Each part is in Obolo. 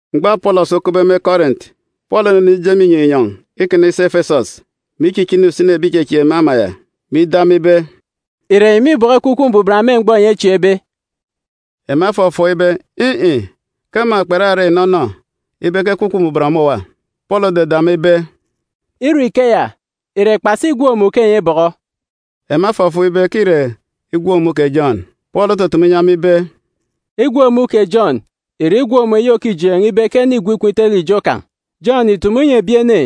Mgbọ Apọlọs okupbe me Kọrint, Pọọlu onenije me inyọn̄ inyọn̄ ikana isi Efesọs, mè ichichini usini ebi ìchechieek me ama ya, mè ido ema ibe, “Ìre enyi mîbọkọ Ekwukwu Mbuban me mgbọ enyi echieekbe?” Ema efọfọọk ibe, in̄-in̄, ke ema kperarak inọnọ ibe ke Ekwukwu Mbuban ọmọ òwa. Pọọlu ododo ema ibe, “Ire ikeya, ìre kpasi igwook-mun̄ ke enyi ebọkọ?” Ema efọfọọk ibe ke îre igwook-mun̄ kè Jọn. Pọọlu otutumu inyi ema ibe, “Igwook-mun̄ kè Jọn ìre igwook-mun̄ eyi òkijeen̄ ibe ke ene îgwu ikom itele ijo kan̄. Jọn ìtumu inyi ebi ene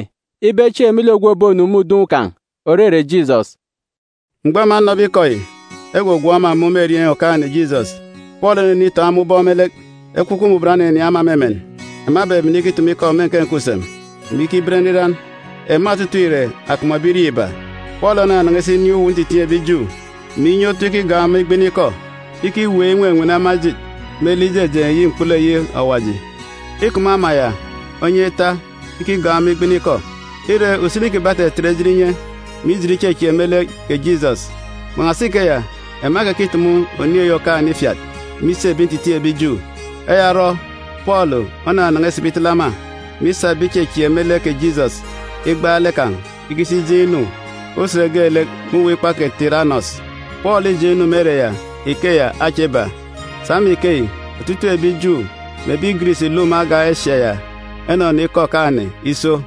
ibe echieek me lek ogwu òbonu me udun̄ kan̄, òrere Jisọs.” Mgbọ ema enọbe ikọ yi, egwogwook ema mun̄ me erieen̄ Okaan̄-ene Jisọs. Pọọlu onenitoon̄ ema ubọk me lek. Ekwukwu Mbuban oninin̄ ema me emen, ema ebebene ikitumu ikọ me nke nke usem, mè ikiben nriran. Ema otutuuk ìre akọp mè ebirieen̄ iba. Pọọlu onanan̄a isi inin̄ uwu ntitiin̄ ebi Ju, mè inye otu ikigọọk ema igbini ikọ ikiweek inwenwene ema ejit me lek ijejeen̄ eyi mkpulu eyi Awaji. Îkup me ama ya onyan̄ ita ikigọọk ema igbini ikọ. Ire, usini kiban̄ etetet ejit inye, mè ijit ichechieek me lek kè Jisọs. Kpan̄asi ikeya ema ekekitumu Oniin̄ eyi Okaan̄-ene ifiat me isi ebi ntitiin̄ ebi Ju. Eya orọ Pọọlu onanan̄a isibi itele ema, mè isa ebi ìchechieek me lek kè Jisọs igbaalek kan̄ ikisi ijeen̄ inu usen geelek me uwu ikpa kè Tiranọs. Pọọlu îjeen̄ inu me ere ya ikeya acha iba. Sa me ikeyi, otutuuk ebi Ju mè ebi Giris ìluk me agan̄ Esia ya enọnọ ikọ Okaan̄-ene iso.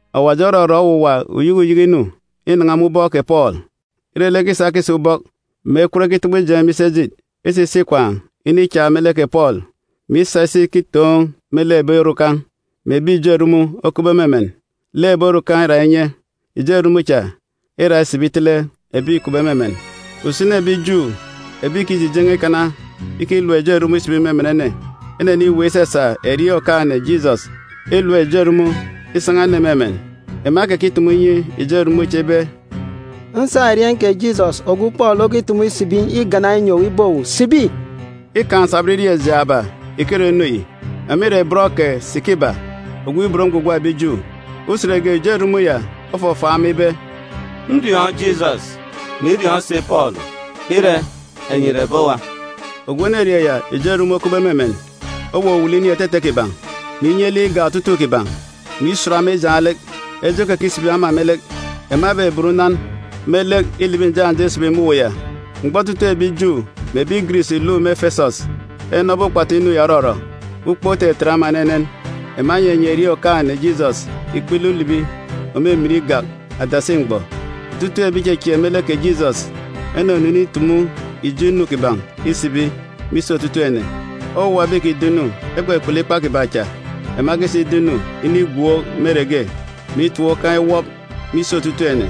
Awaji orọrọ owuwa uyeke uyeke inu inan̄a me ubọk kè Pọọlu, ire lek ekisa akisi ubọk mè ekwut ekitobo ijeen̄ me isi ejit isa isi ikwaan̄ inichak me lek kè Pọọlu, mè isa isi ikitoon̄ me lek ebi orukan̄, mè ebi ijo erumun̄ okupbe me emen, lek ebi orukan̄ îra inye, ijo erumun̄ cha îra isibi itele ebi îkupbe me emen. Usini ebi Ju ebi ìkijijen̄e ikana ikilap ijo erumun̄ isibi me emen ene eneniweek isasa erieen̄ Okaan̄-ene Jisọs ilap ijo erumun̄ isan̄a ene me emen. Ema ekekitumu inyi ijo erumun̄ cha ibe, “Nsa erieen̄ kè Jisọs, ogwu Pọọlu okitumu isibi, igana inyi owu ibe owu, sibi!” Îkaan̄ nsabọn irieen̄ jaaba ìkirọ inu yi. Ema ìre bọn kè Sikiba ogwu ibot ngwugwa ebi Ju. Usen ge, ijo erumun̄ ya ofọfọọk ema ibe, “Nriọọn̄ Jisọs, mè iriọọn̄ si Pọọlu. Ire, enyi ìre ebi owa?” Ogwu enerieen̄ ya ijo erumun̄ okupbe me emen owuwulu inin̄ etete kiban̄, mè inye lek igak otutuuk kiban̄, mè isut ema ijaan̄ lek. Eje okekisibi ema me lek. Ema ebeben unan me lek ilibi njak njak isibi me uwu ya. Mgbọ otutuuk ebi Ju mè ebi Giris ìluk me Efesọs enọbe ukpatu inu ya òrọrọ, ukpook otetet ema enenen. Ema enyinyi erieen̄ Okaan̄-ene Jisọs ikpele ulibi òmimin igak adasi mgbọ. Otutuuk ebi ìchechieek me lek kè Jisọs enunu initumu ijo inu kiban̄ isibi me isi otutuuk ene. Owuwa ebi ìkido ido-inu ekpukpulu ikpa kiban̄ cha ema ekisa ido inu inigwook me ere ge, mè itap ukan̄ iwọp me isi otutuuk ene.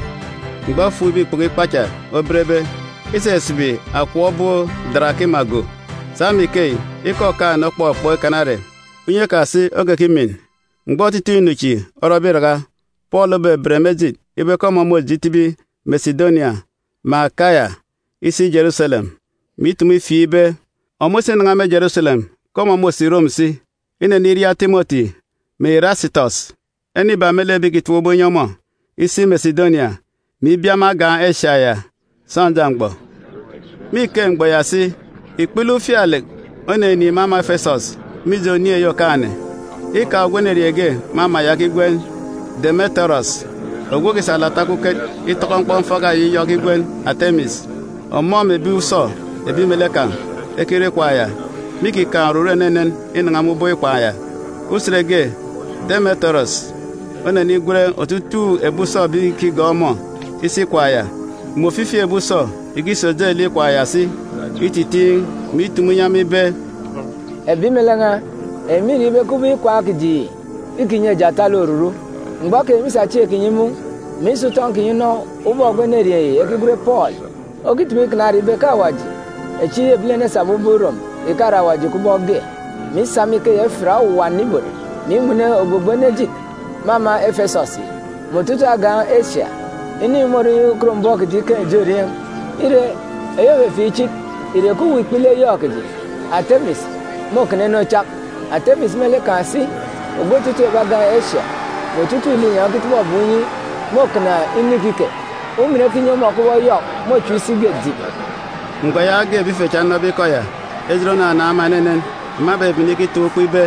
Mgbọ efukbe ikpoko ikpa cha obenbe, isisibi akọp obop darakima go. Sa me ikeyi, ikọ Okaan̄-ene okpọkpọk ikana ere, unye kan̄ si okekimin. Mgbọ otutuuk inu chi orọbe iraka, Pọọlu obeben me ejit ibe ke ọmọ môje itibi Mesidonia mè Akaya isi Jeruselem, mè itumu ifieek ibe, ọmọ isinan̄a me Jeruselem, ke ọmọ môsi Rom si. Ineniria Timọti mè Irasitọs, ene iba me lek ebi ìkitap ubọk inyi ọmọ, isi Mesidonia, mè ibia me agan̄ Esia ya sọnja mgbọ. Me ike mgbọ ya si, ikpele ufialek oninin̄ me ama Efesọs, mije Oniin̄ eyi Okaan̄-ene. Îkaan̄ ogwu enerieen̄ ge me ama ya ekigwen Demetirọs ogwu òkisa alata okuket itọkọ mkpọmfaka eyi yọk ekigwen Atemis. Ọmọ mè ebi usọ ebi melek kan̄ ekirọ ikwaan̄ ya mîkikaan̄ oruru enenen inan̄a me ubọk ikwaan̄ ya. Usen ge, Demetirọs onenigwen otutuuk ebi usọ ebi ìkigọọk ọmọ isi ikwaan̄ ya mè ofifi ebi usọ ìkisi ojelek ikwaan̄ ya si ititiin̄, mè itumu inyi ema ibe, “Ebi melek n̄a, enyi mîriọọn̄ ibe ke ubọk ikwaan̄ kiji yi îkinyi eji atalek oruru. Mgbọ keyi enyi mîsa chieen̄ kinyi imun̄, mè isa utọn̄ kinyi inọ ubọk ogwu enerieen̄ yi ekigwen Pọọlu okitumu ikana ere ibe ke awaji echi ebilene esabe ubọk irom ìkare awaji kubọk ge, mè isa me ikeya ifiat owuwa ene ibot, mè inwene ogbogbo ene ejit me ama Efesọs yi, mè otutuuk agan̄ Esia. Inu yi môrọ inyi ukot mbọm kiji ikaan̄ ijo erieen̄. Ire, eyi òfefieek ichit ìre ke uwu ikpele yọk kiji, Atemis, môkana inu ochak. Atemis me lek kan̄ si, ogwu otutuuk ebi agan̄ Esia, mè otutuuk linyọn̄ ekitọbọ ebum inyi môkana inu ikike. Umin eyi ekinyi ọmọ kubọk yọk môchep isi ge dìp dìp.” Mgbọ yaage ebi ife cha enọbe ikọ ya, ejit onanaan̄ ema enenen, ema ebebene ikitaan̄ ukpo ibe,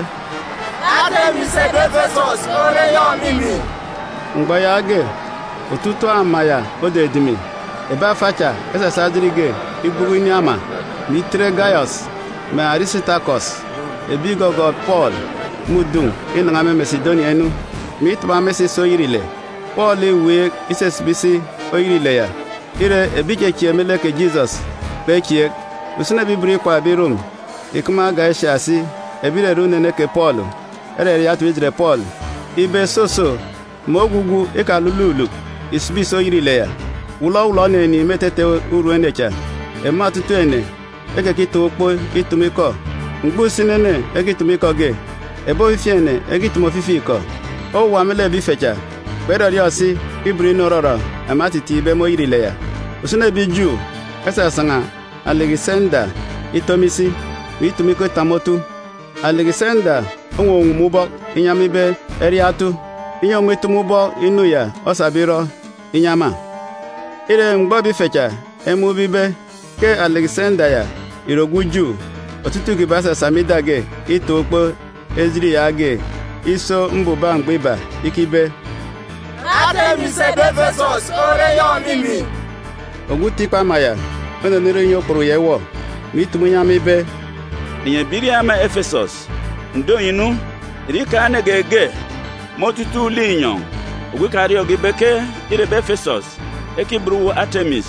“Atemis ebi Efesọs ore yọk òmimin!” Mgbọ yaage, otutuuk ama ya odidimi. Ebi afa cha esasa me ejit ge igbuku inin̄ ama, mè itet Gayọs mè Arisitakọs ebi ìgọgọọk Pọọlu me udun̄ inan̄a me Mesidonia inu, mè itaba ema isa isi oyet ile. Pọọlu îweek isisibi isi oyet ile ya, ire, ebi ìchechieek me lek kè Jisọs kpechieek. Usini ebi ibot ikwaan̄ ebi Rom ìkup me agan̄ Esia si ebi ìrere unene kè Pọọlu eraria etip ijet Pọọlu ibe, soso, mè ogwugwu ikalululuk ìsibi ìsi oyet ile ya. Wọlọwọlọ oninin̄ me etete urum ene cha, ema otutuuk ene ekekitaan̄ ukpo itumu ikọ. Mgbọ usini ene ekitumu ikọ ge, ebi ofifi ene ekitumu ofifi ikọ. Owuwa me lek ebi ife cha kperọriọọn̄ si ibot inu òrọrọ ema etitiin̄be me oyet ile ya. Usini ebi Ju esasan̄a Alikisenda ito me isi, mè itumu ikọ itap me otu. Alikisenda owuwuwum ubọk inyi ema ibe eriaan̄ otu, inyi ọmọ itumu ubọk inu ya osabe irọ inyi ema. Ire, mgbọ ebi ife cha emun̄be ibe ke Alikisenda ya ìre ogwu Ju, otutuuk kiban̄ esasa me ida ge itaan̄ ukpo ejit yaage iso mbubak mgbọ iba, ikibe, “Atemis ebi Efesọs ore yọk òmimin!” Ogwu uti ikpa ama ya onenirọ inyi okput ya iwọ, mè itumu inyi ema ibe, “Enyi ebirieen̄ ama Efesọs, ǹdo enyi nu, ìre îkaan̄ ene geege me otutuuk linyọn̄ ogwu ikariọọn̄ge ibe ke îre ebi Efesọs ekiban uwu Atemis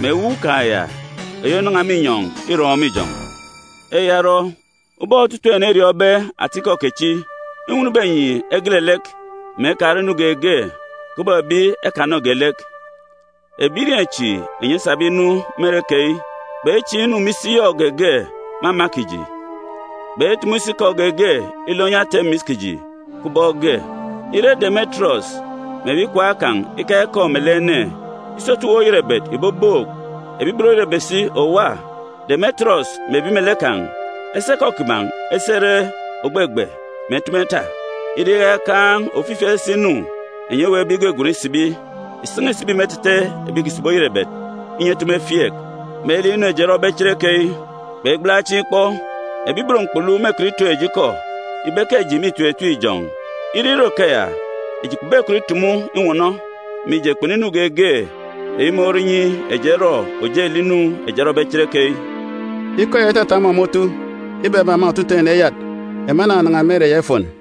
mè ewuuk kan̄ ya eyi ònan̄a me inyọn̄ irọn̄ me ijọn̄? Eya orọ, ubọk otutuuk ene eriọọn̄be atikọ kechi, înwọn ibe enyi egele lek, mè ekarọ inu geege kubọk ebi ekanọge lek. Ebirieen̄ chi enyi esabe inu me ere keyi kpechiin̄ inu me isi yọk geege me ama kiji, kpetumu si ikọ geege ilọ inyi Atemis kiji kubọk ge. Ire Demetirọs mè ebi ikwaan̄ kan̄ ikaan̄ ikọ melek ene, isotu uwu oyerebet ìbobook, ebi ibot oyerebet si òwa. Demetirọs mè ebi melek kan̄ esa ikọ kiban̄ esi ere ògbegbe, mè etumu eta. Ire iyaka ikaan̄ ofifi esese inu enyi eweekbe igwegwen isibi, ìsan̄a ìsibi me etete ebi ìkisibi oyerebet, inyi etumu efieek. Me lek inu eji erọbe cherekeyi, kpegbala chieen̄ ikpọ, ebi ibot mkpulu mêkọt itoon̄ eji ikọ, ibe ke eji mîtim etim ijọn̄. Ire irọ ikeya, eji kpebekọt itumu inwọnọ, mije, kpunu inu geege eyi morọ inyi eji erọ ojelek inu eji erọbe cherekeyi.” Ikọ ya itata ọmọ me otu, ibebe ema otutuuk ene eyat. Ema enanan̄a me ere ya ifon.